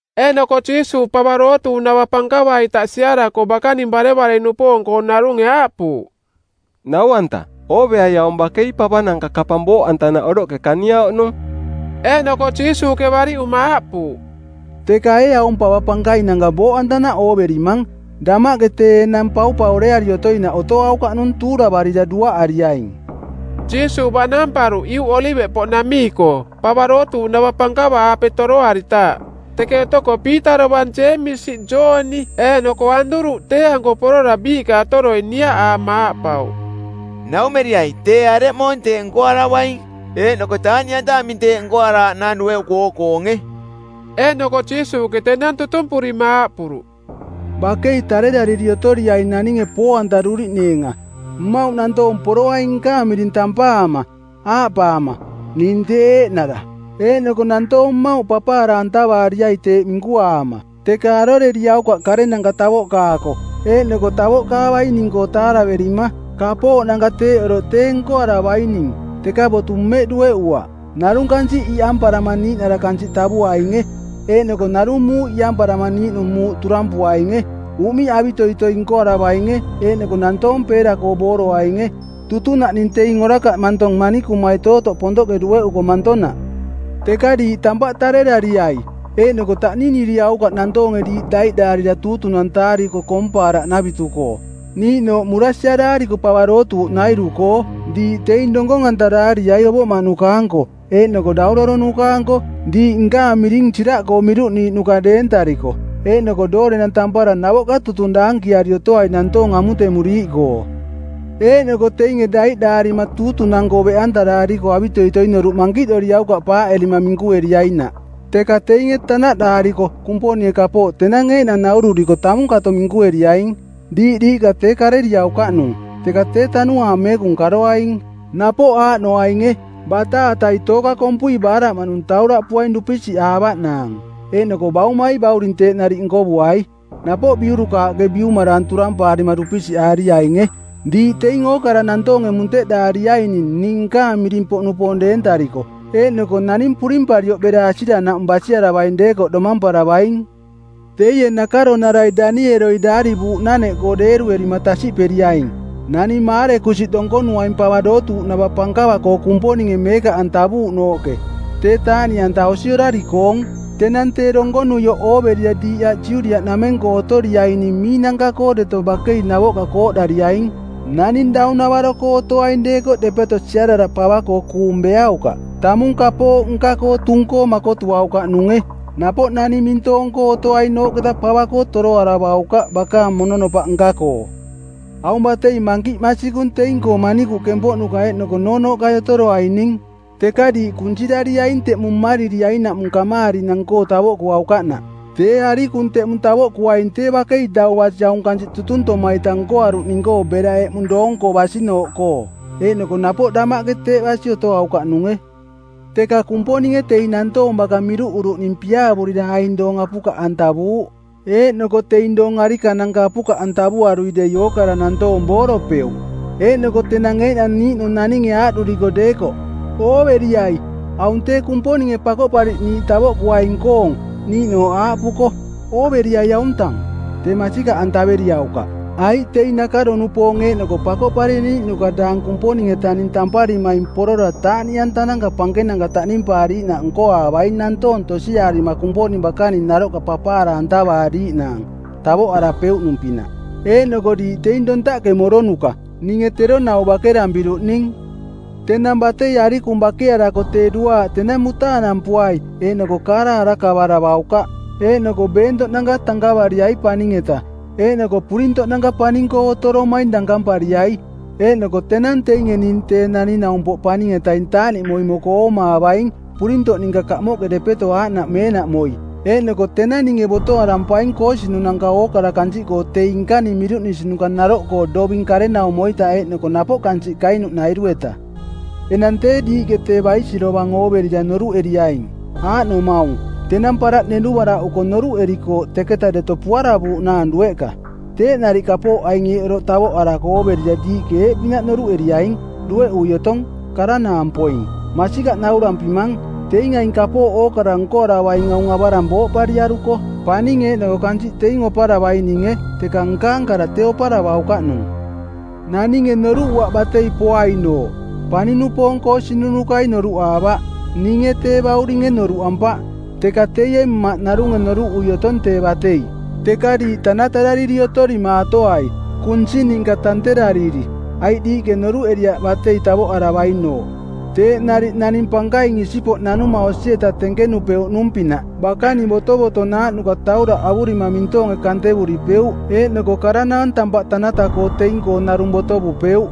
Eeꞌnoko Jiisuuꞌ pava dootuuꞌnava pankava-ita siarako bakaning barevare-nupoong-koo narunge aaꞌpuuꞌ, “Nau-anta, ooveai aung bakei pavananka kapang booꞌantanaꞌ oroꞌke kaniauꞌnung.” Eeꞌnoko Jiisuuꞌke bariꞌuma aaꞌpuuꞌ, “Teka ee aung pava pankainanka booꞌantanaꞌ ooverimang? Damaꞌke tee enang paupaureari otoinaꞌ otoaukaꞌnung tuuravarira duaꞌariaing.” Jiisuuꞌ baꞌnamparuꞌ Iuꞌ Oliveꞌpoꞌnamii-koo, pava dootuuꞌnava pankava-aape toroaritaaꞌ. Teke otoko Piita dovang Jeemisi, Jooni eeꞌnoko Aanduruꞌ tee-anko porora biiꞌka otoroi niaꞌaama aaꞌpauꞌ, “Naumeriai tee areꞌmoong teeꞌ nkoaravaing? Eeꞌnoko taaꞌniꞌanta aming teeꞌ nkoaraaꞌnaang dueꞌuko ooꞌkoonge?”. Eeꞌnoko Jiisuuꞌke tenang tutumpurima aaꞌpuruꞌ, “Bakei tarerariri otoriaing naninge poo-antaruriꞌneenga. Mmauꞌ nantoong poroaing nkaang miring tampaama, aaꞌpaama, ‘Ning tee eeꞌnara.’ Eeꞌnoko nantoong mmauꞌ papaara-antavaariai teeꞌ minkuaama. Teka aroreriaukaꞌ karenanka tavoꞌkaako eeꞌnoko tavoꞌkaavaining-koo taaraverima. Kapooꞌnanka teeꞌ oroꞌ tee nkoaravaining, teka botu mmeꞌ dueꞌuaꞌ. Narung kansiꞌ iꞌamparama niiꞌnara kansiꞌ tavuainge, eeꞌnoko narung muuꞌ iꞌamparama niiꞌnung muuꞌ turampuainge. Uꞌmiꞌ avitoitoi nkoaravainge eeꞌnoko nantoong peera-koo booroainge. Tutunaꞌning teing orakaꞌ mantong manikumai tootoꞌ pontoꞌke dueꞌuko mantonaꞌ. Teka diiꞌ tampaꞌ tarerariai. Eeꞌnoko taꞌniniriaukaꞌ nantoonge diiꞌ daiꞌdaarira tuutunantaariko koompaaraꞌnavitu-koo, niiꞌnooꞌ murasiaraariko pava dootuuꞌnairu-koo. Diiꞌ teing donkong-antaraariai ovoꞌmaꞌnuka-anko eeꞌnoko dauraronuka-anko diiꞌ nkaang miring siraꞌkoo miruꞌniiꞌnuka deentarikoꞌ. Eeꞌnoko doorenang tampara navoꞌka tutung daankiari otoai nantoong amutemuriiꞌkoo. Eeꞌnoko teinge daiꞌdaarima tuutunang-koo beꞌantaraariko avitoitoi noruꞌ mankiꞌ doriaukaꞌ paaꞌerima minkueriainaꞌ. Teka teinge tanaꞌdaariko, Kumponinge kapooꞌ tenang eeꞌnang naururiko tamung kato minkueriaing. Diiꞌ diiꞌka tee kareriaukaꞌnung, teka tee Tanuaang Meekung karoaing. Napoꞌ aaꞌnoainge: bataatai tooka kompui baaraꞌmaꞌnung tauraꞌpuaing dupisiꞌaavaꞌnaang, eeꞌnoko baumai bauring teeꞌ nariꞌ nkovuai. Napoꞌ biurukaaꞌke biumaraang turampaarima dupisiꞌaariainge. Diiꞌ teing ookara nantoonge munteꞌdaariaining ning nkaang miring-poꞌnupoong deentariko, eeꞌnoko naning purimparioꞌ bera asiranaꞌmung basiaravaing deekoꞌ domamparavaing.” “Teie nakaronarai Danieloi daarivuuꞌnaneꞌkoo deeruerima tasiꞌperiaing: ‘Naning maarekusiꞌ donkonuaing pava dootuuꞌnava pankava-koo Kumponinge meekaꞌantavuuꞌnooꞌke.’ Tee taaꞌniꞌanta osi orari-koong. Tenang tee donkonuioꞌ ooverira diiꞌ aꞌ Judiaꞌnameng-koo otoriaining miinanka-koo deto bakei navoꞌka kooꞌdariaing! Naning daunavaro-koo otoaing deekoꞌ depeto siarara pava-koo kuung beaukaꞌ. Tamung kapooꞌ nka-koo tung-koo makotuaukaꞌnunge. Napoꞌ naning mintoong-koo otoainooꞌketa pava-koo toroaravaukaꞌ bakaang mononopaꞌ nka-koo. Aung batei mankiꞌ masikung teing-koo manikuꞌ kempoꞌnuka eeꞌnoko noonooꞌkai otoroaining. Teka diiꞌ kunsirariaing teꞌmung mmaririainaꞌmung kamaarinang-koo tavoꞌkuaukaꞌnaꞌ. Tee arikung teꞌmung tavoꞌkuaing tee bakei dau basi aung kansiꞌ tutuntoma-ita nkoaruꞌning-koo bera eꞌmung doong-koo basinooꞌkoo, eeꞌnoko napoꞌ damaꞌke teeꞌ basi otoaukaꞌnunge. Teka Kumponinge teing nantoong baka miruꞌuruꞌning piaavurira aing doong apukaꞌantavuuꞌ. Eeꞌnoko teing doong arikananka apukaꞌantavuriarui dei ookara nantoong booropeuꞌ. Eeꞌnoko tenang eeꞌnang niiꞌnung naninge aaꞌduriko deekoꞌ, ‘Ooveriai, aung tee Kumponinge Pakoꞌpariꞌniiꞌ tavoꞌkuaing-koong!’ niiꞌnooꞌ aaꞌpuko, ‘Ooveriai auntang!’ tee masikaꞌantaveriaukaꞌ. Aiꞌ teing nakaro-nupoong eeꞌnoko pakoꞌpariꞌniiꞌnuka daang Kumponing-etaning tamparimaing porora taaꞌniꞌanta pankenanka taꞌnimpaariiꞌnaꞌ nkoaavaing nantoong tosiaarima Kumponing bakaning naroꞌka papaara-antavaariiꞌnaang, tavoꞌarapeuꞌnung-pinaꞌ. Eeꞌnoko diiꞌ teing dontaꞌke moronuka. Ninge tero nau bakerampiruꞌning.” “Tenang batei arikung bakearako tee duaaꞌ tenang mutaanampuai eeꞌnoko kaara arakavaravaukaꞌ. Eeꞌnoko beentoꞌnanka tankavariai paning-eta. Eeꞌnoko purintoꞌnanka paning-koo otoromaing dankampariai. Eeꞌnoko tenang teinge ning Tee Naning-naumpoꞌ Paning-etaing taaꞌniꞌmoi moko oomaavaing, purintoꞌ ninka kamoꞌke depeto aaꞌnaꞌ meenaꞌmoi. Eeꞌnoko tenang ninge botoarampaing koosinunanka ookara kansiꞌkoo teing nkaning miruꞌnisinuka naroꞌkoo doving karenaumo-ita eeꞌnoko napoꞌ kansiꞌ kainuꞌnairu-eta.” “Enang tee diiꞌke tee baisirovang ooverira noruꞌeriaing, aaꞌnomaung: Tenang paraꞌ nenuvaraꞌuko noruꞌerikooꞌ teketa deto puaravuuꞌnaang dueꞌka. Teeꞌ nariꞌ kapooꞌ aing eeꞌ oroꞌ tavoꞌarako ooverira diiꞌke eeꞌpinaꞌ noruꞌeriaing, dueꞌui otong, karanaang poing. Masikaꞌ naurampimang, Teing aing kapooꞌ ookara nkoaravaing aung avarang booꞌpariaruko. Paning eeꞌnoko kansiꞌ teing oparavaininge teka nkaang kara tee oparavaukaꞌnung.” “Naninge noruꞌuaꞌ batei poainooꞌ. Paning-nupoong koosinunukai noruꞌaavaꞌ. Ninge tee bauringe noruꞌampaꞌ. Teka teie Mmaꞌ narunge noruꞌui otong tee batei. Teka diiꞌ tanatarariri otorimaatoai, kunsi ninka tanterariri, aiꞌ diiꞌke noruꞌeriaꞌ batei tavoꞌaravainooꞌ. Teeꞌ nariꞌ naning pankaing isipoꞌ nanuma osi-eta tenkenupeuꞌnung-pinaꞌ bakaning botovotonaaꞌnuka tauraꞌ avurima mintoonge kantevuripeuꞌ eeꞌnoko karanaang tampaꞌ tanata-koo teing-koo narung botovupeuꞌ.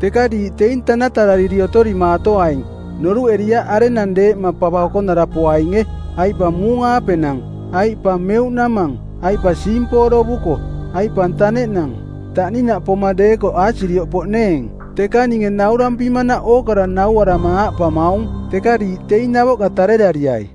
Teka diiꞌ teing tanatarariri otorimaatoaing. Noruꞌeriaꞌ arenang deeꞌma pava okonara poainge, aiꞌ pa muung-aapenang, aiꞌ pa meuꞌnamang, aiꞌ pa siimporovuko˜, aiꞌ pa taneꞌnang. Taꞌninaꞌ poma deekoꞌ aasirioꞌ poꞌneeng. Teka ninge naurampimanaꞌ ookara nauarama aaꞌpamaung: Teka diiꞌ teing navoꞌka tarerariai.”